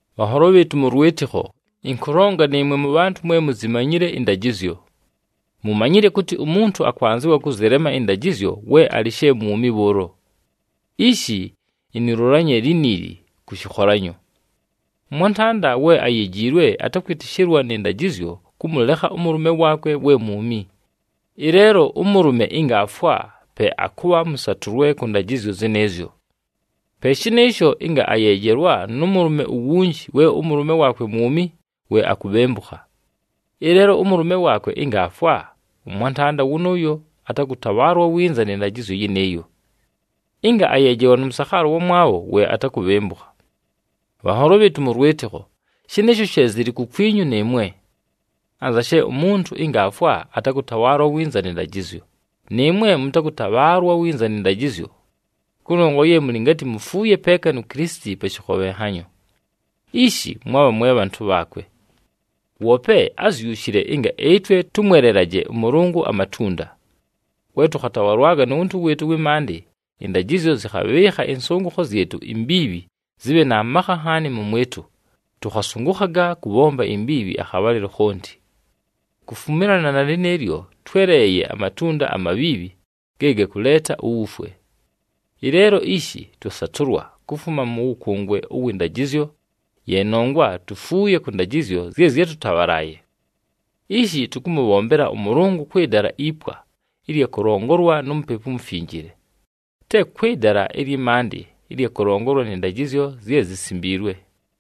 Bhanholo bhɨɨtʉ mʉ lwɨtɨkho, ɨnkʉlonga nɨɨmwe mʉbhantʉ mwe muzimanyile ɨndajɨzyo. Mumanyile kʉtɨ umuntu akwanzɨwa kʉzɨlema ɨndajɨzyo we alɨ she mwumi bhʉʉlo. Ishi inilulanye liniili kʉ shɨkholanyo. Ʉmwantanda we ayejiilwe atakwɨtɨshɨlwa nɨ ndajɨzyo kʉmʉlekha ʉmʉlʉme waakwe we mwumi. Ɨleelo ʉmʉlʉme ɨnga aafwa, pe akʉbha mʉsatʉlwe kʉ ndajɨzyo zɨnɨɨzyo. Pe shɨnɨɨsho, ɨnga ayeejelwa nʉ mʉlʉme uwunji we ʉmʉlʉme waakwe mwumi, we akubhembukha. Ɨleelo ʉmʉlʉme waakwe ɨnga aafwa, ʉmwantanda wʉnʉʉyo atakʉtabhaalwa winza nɨ ndajɨzyo yɨnɨɨyo. Ɨnga ayeejelwa nʉ mʉsakhaala ʉwamwabho, we atakubhembukha. Bhanholo bhɨɨtʉ mʉ lwɨtɨkho, shɨnɨɨsho she zɨlɨ kukwinyu nɨɨmwe. Anza she umuntu ɨnga aafwa atakʉtabhaalwa winza nɨ ndajɨzyo, nɨɨmwe mʉtakʉtabhaalwa winza nɨ ndajɨzyo, kʉnongwa ye mʉlɨ ngatɨ mufuuye peeka nu Kilisiti pa shɨkhobhenhanyo. Ishi mwabha mwe bhantʉ bhaakwe. Woope ázyushile ɨnga ɨtwe tʉmwelelaje ʉMʉlʉngʉ amatunda. We tʉkhatabhalwaga nu wuntu wɨɨtʉ ʉwɨ maandɨ, ɨndajɨzyo zɨkhabhɨɨkha ɨnsʉngʉkho zyɨtʉ imbiibhi zɨbhe na makha nhaani mʉmwɨtʉ, tʉkhasʉngʉkhaga kʉbhomba imbiibhi akhabhalɨlo khonti. Kufumilana na lɨnɨɨlyo, twéleeye amatunda amabhiibhi ge gakʉleeta uwufwe. Ɨleelo ishi twasatʉlwa kufuma mʉ wʉkʉngwe ʉwɨ ndajɨzyo, ye nongwa tufuuye kʉ ndajɨzyo zye zyátʉtabhalaaye. Ishi tʉkʉmʉbhombela ʉMʉlʉngʉ kwɨ dala ipwa ɨlya kʉlongolwa nu Mupepu uMufinjile, te kwɨ dala ɨlyɨ maandɨ ɨlya kʉlongolwa nɨ ndajɨzyo zye zisimbiilwe.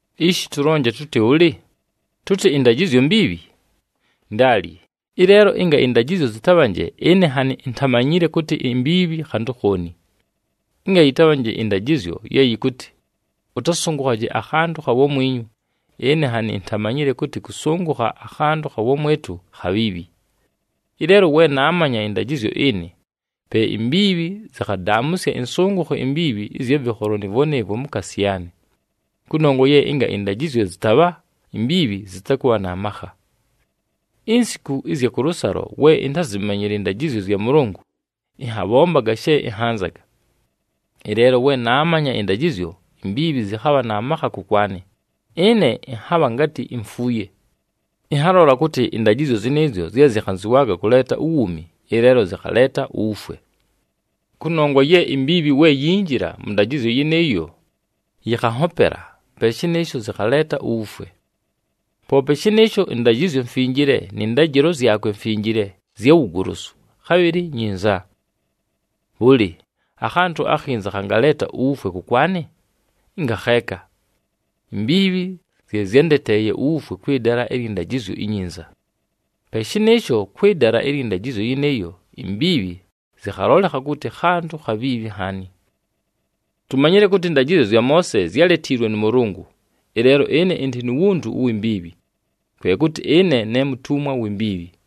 Ishi tʉlonje tʉtɨ bhʉlɨ? Tʉtɨ ɨndajɨzyo mbiibhi? Ndaali! Ɨleelo ɨnga ɨndajɨzyo zɨtabhanje, ɨne nhanɨ intamanyile kʉtɨ imbiibhi khantʉ khooni. Ɨnga yɨtabhanje ɨndajɨzyo ye yɨkʉtɨ, “Ʉtasʉngʉkhaje akhantʉ kha wamwinyu,” ɨne nhanɨ intamanyile kʉtɨ kʉsʉngʉkha akhantʉ kha wamwɨtʉ khabhiibhi. Ɨleelo we naamanya ɨndajɨzyo ɨnɨ, pe imbiibhi zɨkhadaamʉsya ɨnsʉngʉkho imbiibhi ɨzya vɨkholo nɨɨvwo nɨɨvwo mukaasi yaanɨ. Kʉnongwa ye ɨnga ɨndajɨzyo zɨtabha, imbiibhi zɨtakʉbha na makha. Insiku ɨzya kʉlʉsalo we intázimanyile ɨndajɨzyo zya Mʉlʉngʉ, ɨnhambombaga she ɨnhanzaga. Ɨleelo we naamanya ɨndajɨzyo, imbiibhi zɨkhabha na makha kʉkwanɨ, ɨne ɨnhabha ngatɨ imfuuye. Ɨnhalola kʉtɨ ɨndajɨzyo zɨnɨɨzyo zye zɨkhanzɨwaaga kʉleeta uwuumi, ɨleelo zɨkhaleeta uwufwe. Kʉnongwa ye imbiibhi we yinjila mʉ ndajɨzyo yɨnɨɨyo, yɨkhanhopela, pe shɨnɨɨsho zɨkhaleeta uwufwe. Poope shɨnɨɨsho, ɨndajɨzyo mfinjile nɨ ndajɨlo zyakwe mfinjile, zya wugolosu, khabhɨlɨ nyinza. Bhʉlɨ, akhantʉ akhinza khangaleeta uwufwe kʉkwanɨ? Ngakheeka! Imbiibhi zye zyándeteeye uwufwe kwɨ dala ɨlyɨ ndajɨzyo inyinza. Pe shɨnɨɨsho, kwɨ dala ɨlyɨ ndajɨzyo yɨnɨɨyo, imbiibhi zɨkhalolekha kʉtɨ khantʉ khabhiibhi nhaani. Tumanyile kʉtɨ ɨndajɨzyo zya Moose zyáletiilwe nʉ Mʉlʉngʉ, ɨleelo ɨne ɨndɨ nu wuntu uwi mbiibhi, kwe kʉtɨ ɨne ne mutumwa wi mbiibhi.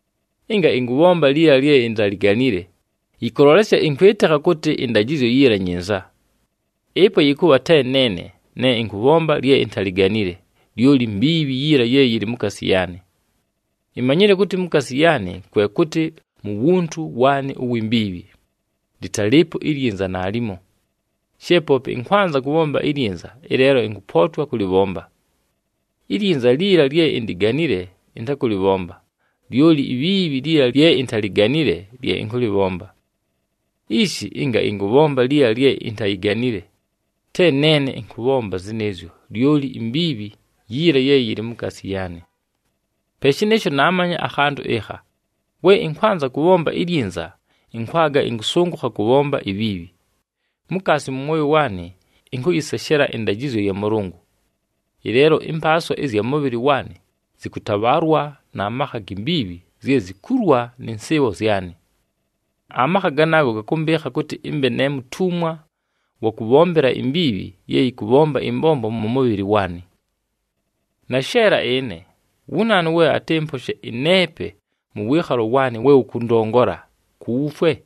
Ɨnga ɨnkʉbhomba liila lye intaliganile, yɨkʉlolesya ɨnkwɨtɨkha kʉtɨ ɨndajɨzyo yiila nyinza. Ɨpo yɨkʉbha te neene ne ɨnkʉbhomba lye intaliganile, lyoli mbiibhi yiila ye yɨlɨ mukaasi yaanɨ. Imanyile kʉtɨ mukaasi yaanɨ, kwe kʉtɨ mu wuntu waanɨ uwi mbiibhi, lɨtalɨɨpo ilyinza naalimo. She poope ɨnkwanza kʉbhomba ilyinza, ɨleelo ɨnkʉpootwa kʉlɨbhomba. Ilyinza liila lye indiganile ɨntakʉlɨbhomba, lyoli ibhiibhi liila lye intaliganile lye ɨnkʉlɨbhomba. Ishi, ɨnga ɨnkʉbhomba liila lye intayiganile, te neene ɨnkʉbhomba zɨnɨɨzyo, lyoli imbiibhi yiila ye yɨlɨ mukaasi yaanɨ. Pe shɨnɨɨsho, naamanya akhantʉ ɨkha: we ɨnkwanza kʉbhomba ilyinza, ɨnkwaga ɨnkʉsʉngʉkha kʉbhomba ibhiibhi. Mukaasi mʉ mwoyo waanɨ ɨnkʉyɨseshela ɨndajɨzyo ya Mʉlʉngʉ. Ɨleelo, ɨmpaaswa ɨzya mʉbhɨlɨ waanɨ zɨkʉtabhaalwa na makha gi mbiibhi zye zikulwa nɨ nsɨɨbho zyanɨ. Amakha ganaago gakʉmbɨɨkha kʉtɨ ɨmbe ne mutumwa wa kʉbhombela imbiibhi ye yɨkʉbhomba ɨmbombo mʉ mʉbhɨlɨ waanɨ. Nasheela ɨne! Wu naanu we atɨmposhe ɨneepe mʉ wɨɨkhalo waanɨ we wʉkʉndongola ku wufwe?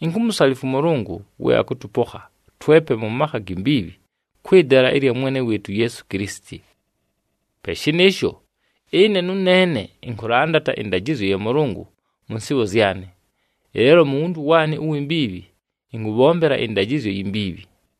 Inkumusalifwa ʉMʉlʉngʉ we akʉtʉpokha twepe mʉ makha gi mbiibhi kwɨ dala ɨlya Mwene wɨɨtʉ uYeesu Kilisiti! Pe shɨnɨɨsho, ɨne nʉneene ɨnkʉlandata ɨndajɨzyo ya Mʉlʉngʉ mʉ nsɨɨbho zyanɨ, ɨleelo mu wuntu waanɨ uwi mbiibhi, ɨnkʉbhombela ɨndajɨzyo yi mbiibhi.